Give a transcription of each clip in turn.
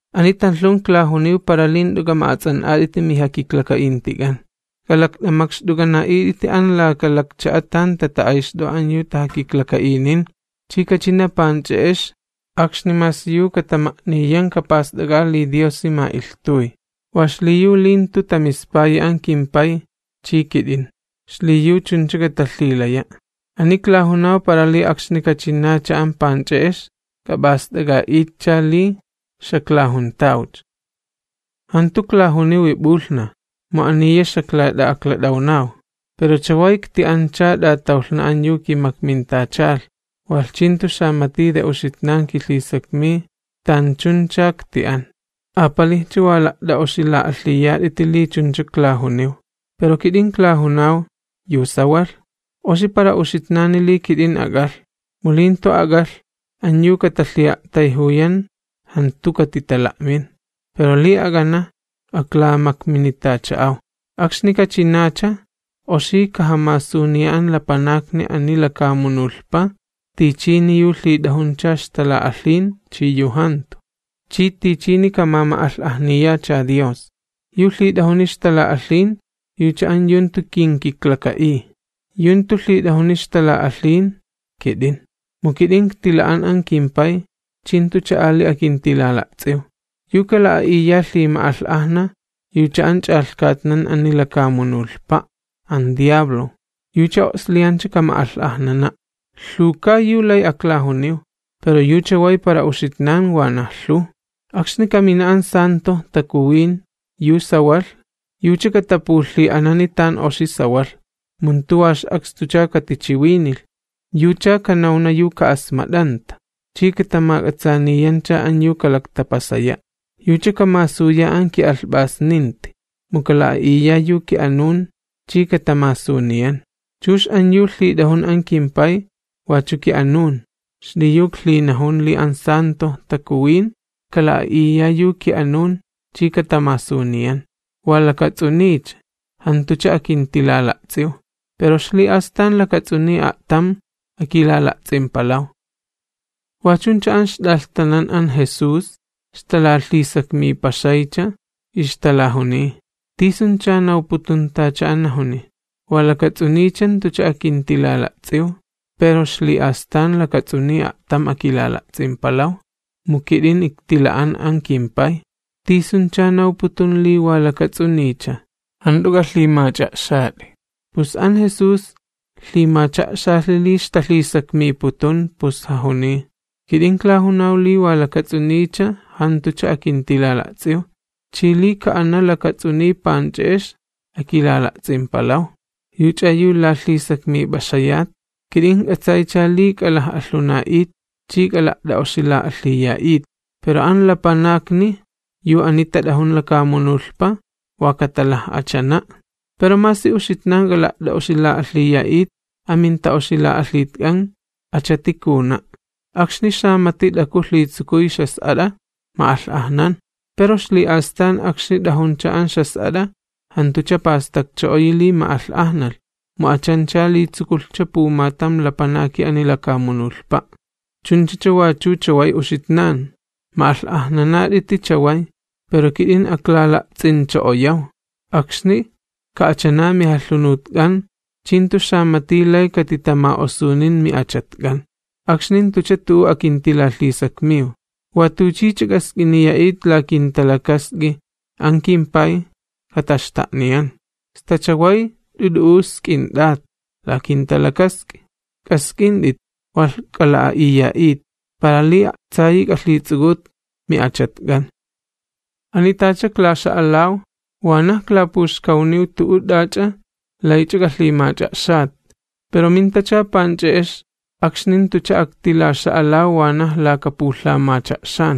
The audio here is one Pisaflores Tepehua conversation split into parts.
’Ani tanlhun iklajuniw para li jant'u k'ama'ats'an'at'iti mijakiklaka'intik'an. K'alakt'amakxt'uk'ana'it'iti an laka lakcha'a tan tata'ayxt'o'a an yu tajakiklaka'inin, chi kachina panch'e'ex akxni masi yu katama'niyan kapast'ak'a li Diosi ma'ilhtuy. Wa xliyu li jantu tamispayi an kimPay chi kit'in, xliyu chuncha katalhilaya'. Ani iklajunaw para li akxni kachinacha an panch'e'ex, k'ap'ast'ak'a'itcha li xaklajuntawcha. ’Jantu iklajuniwi p'ulhnaj, mu aniya xaklat'a'aklat'awnaw. Pero chaway ikti'ancha t'atawlhna an yu kimakmintachalh, walh chi jantu xamati yu uxitnan kilhisakmiy tanchuncha ikti'an. Apalijcha wa la't'a'oxila'alhiyat'iti li chunchacha iklajuniw. Pero kit'in iklajunaw yu sawalh: Oxi para uxitnani li kit'in ak'alh. Mu li jantu ak'alh, an yu katalhi'a'tayjuyan jantu katitala'min, pero li ak'ana, aklamakminitacha'aw. Akxni kachinacha, oxi kajamasuniya an lapanakni ani lakamunulhpa tichini yu lhit'ajuncha ixtala'alhin chi yu jantu, chi tichini kamama'alh'ajniyacha Dios. Yu lhit'ajuni ixtala'alhin yucha an yu jantu kinkiklaka'iy, yu jantu lhit'ajun ixtala'alhin, kit'in. Mu kit'in iktila'an an kimPay, chi jantucha ali akintilala'ts'iw. Yu kala'a'iya lhima'alh'ajna, yucha an ch'alhkatnan ani lakamunulhpa', an xapay makxkay'un, yucha o'sliyancha kama'alh'ajnana'. ’Lhuwka yu lay aklajuniw, pero yu chaway para uxitnan wanaj lhuw. Akxni kamina an Stalan'a Takuwin yu sawalh, yucha katapulhi'anani tan oxi sawalh, mu jantu wa ix'akstucha katichiwinilh, yucha kanawna yu ka'asmat'anta, chi katamak'atsaaniyancha an yu kalaktapasaya'. Yucha kamasuya an ki'alhp'asninti, mu kala'a'iya yu ki'anun chi katamasuniyan. Chux an yu lhit'ajun an kimPay, wachu ki'anun, xliyu iklhinajun li an Stalan'a Takuwin kala'a'iya yu ki'anun chi katamasuniyan. ’Wa lakats'uniycha, jantucha akintilala'ts'iw, pero ixli'astan lakats'uniy a'tam akilala'ts'impalaw. Wa chuncha an ixt'alhtanan an Jesús ixtalalhisakmipaxaycha, ixtalajuniy: ―¿Tisuncha nawputun tacha an najuni? Wa lakats'uniycha jantucha akintilala'ts'iw, pero ixli'astan lakats'uniy a'tam akilala'ts'impalaw, mu kit'in iktila'an an kimPay. ¿Tisuncha nawputun li “wa lakats'uniycha”? Jant'u k'alhimach'a'xat'i. Pus an Jesús lhimacha'xalhi li ixtalhisakmiputun, pus jajuniy: ―Kit'in iklajunaw li wa lakats'uniycha jantucha akintilala'ts'iw, chi li ka'ana lakats'uniy panch'e'ex akilala'ts'impalaw. ¿Yuch'a yu lalhisakmip'axayat? Kit'in ijk'atsaycha li k'alaj'alhuna'it chi k'ala't'a'oxila'alhiya'it, pero an lapanakni yu ani tat'ajun lakamunulhpa wa katalaj'achana'. Pero masi uxitnan k'ala't'a'oxila'alhiya'it, aminta'oxila'alhitk'an achati kajuna'. Akxni xamati t'aku lhitsukuy ixjas'at'a, ma'alh'ajnan. Pero ixli'astan akxni t'ajuncha an ixjas'at'a, jantucha pastakcho'oyi li ma'alh'ajnalh, mu achancha li tsukulhcha pumatam lapanaki ani lakamunulhpa'. Chunchacha wachu chaway uxitnan, ma'alh'ajnanat'iti chaway, pero kit'in aklala'ts'incho'oyaw, akxni ka'achana mijalhunutk'an chi jantu xamati lay katitama'osunin mi'achatk'an. ’Akxni jantucha tu'u akintilalhisakmiw. Wa tuchicha k'ask'iniya'it la kinta'a'ut an kimPay, kataxta'niyan. Sta chaway jant'u t'u'u sk'int'at la kinta'a'ut. K'ask'int'it walh k'ala'a'iya'it, para li a'tsayi k'alhits'uk'ut mi'achatk'an. ’Ani tacha iklaxa'alaw wanaj iklapuxkawniw tu'u t'ach'a laych'a k'alhimach'a'xat, pero mintacha panch'e'ex akxni jantucha aktilaxa'alaw wanaj laka pulhamacha'xan,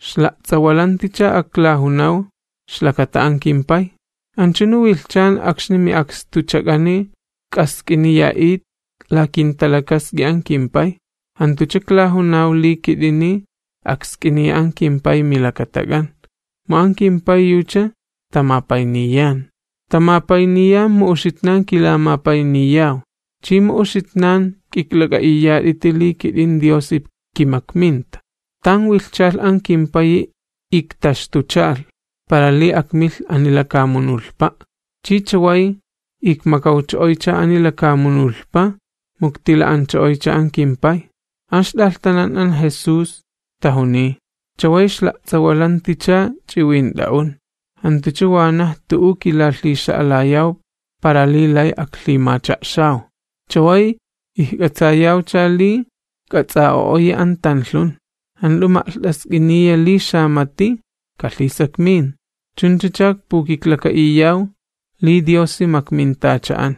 ixla'ts'awalanticha aklajunaw ixlakata an kimPay. Anchunu wilhchan akxni mi'akstuchak'ani k'ask'iniya'it la kinta'a'ut an kimPay, jantucha iklajunaw li kit'ini aksk'iniya an kimPay milakatak'an, mu an kimPay yucha tamapayniyan. Tamapayniyan mu uxitnan kilamapayniyaw, chi mu uxitnan k'iklak'a'iyat'iti li kit'in Diosi kimakminta. Tan wilhchalh an kimPayi iktaxtuchalh, para li akmilh ani lakamunulhpa', chi chaway ikmakawcho'oycha ani lakamunulhpa mu iktila'ancho'oycha an kimPay. An ixt'alhtanan an Jesús tajuniy: ―Chaway ixla'ts'awalanticha ch'iwint'a'un, jantucha wanaj tu'u kilalhixa'alayaw para li lay aklhimacha'xaw. Chaway ijk'atsayawcha li k'ats'a'o'oyi an tanlhun, jant'u ma'lht'ask'iniya li xamati kalhisakmin. Chunchacha ikpukiklaka'iyaw li Diosi makmintacha'an.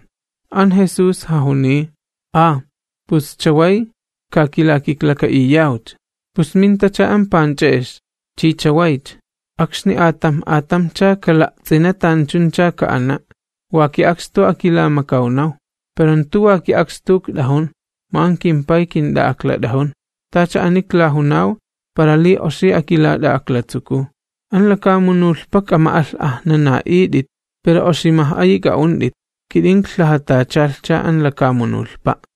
An Jesús jajuniy: ―¿Ah, pus chaway ka kilakiklaka'iyawcha? Pus mintacha an panch'e'ex, chi chawaycha, akxni atamj atamjcha kala'ts'ina tanchuncha ka'ana', wa ki'akstu akilamakawnaw. Pero jantu wa ki'akstu ikt'ajun, mu an kimPay kint'a'aklat'ajun. Tacha ani iklajunaw para li oxi akilat'a'aklatsukuw. Ani lakamunulhpa k'ama'alh'ajnana'it'it, pero oximaj'ayi k'a'unt'it, mu kit'in iklaklhajatacha an lakamunulhpa'.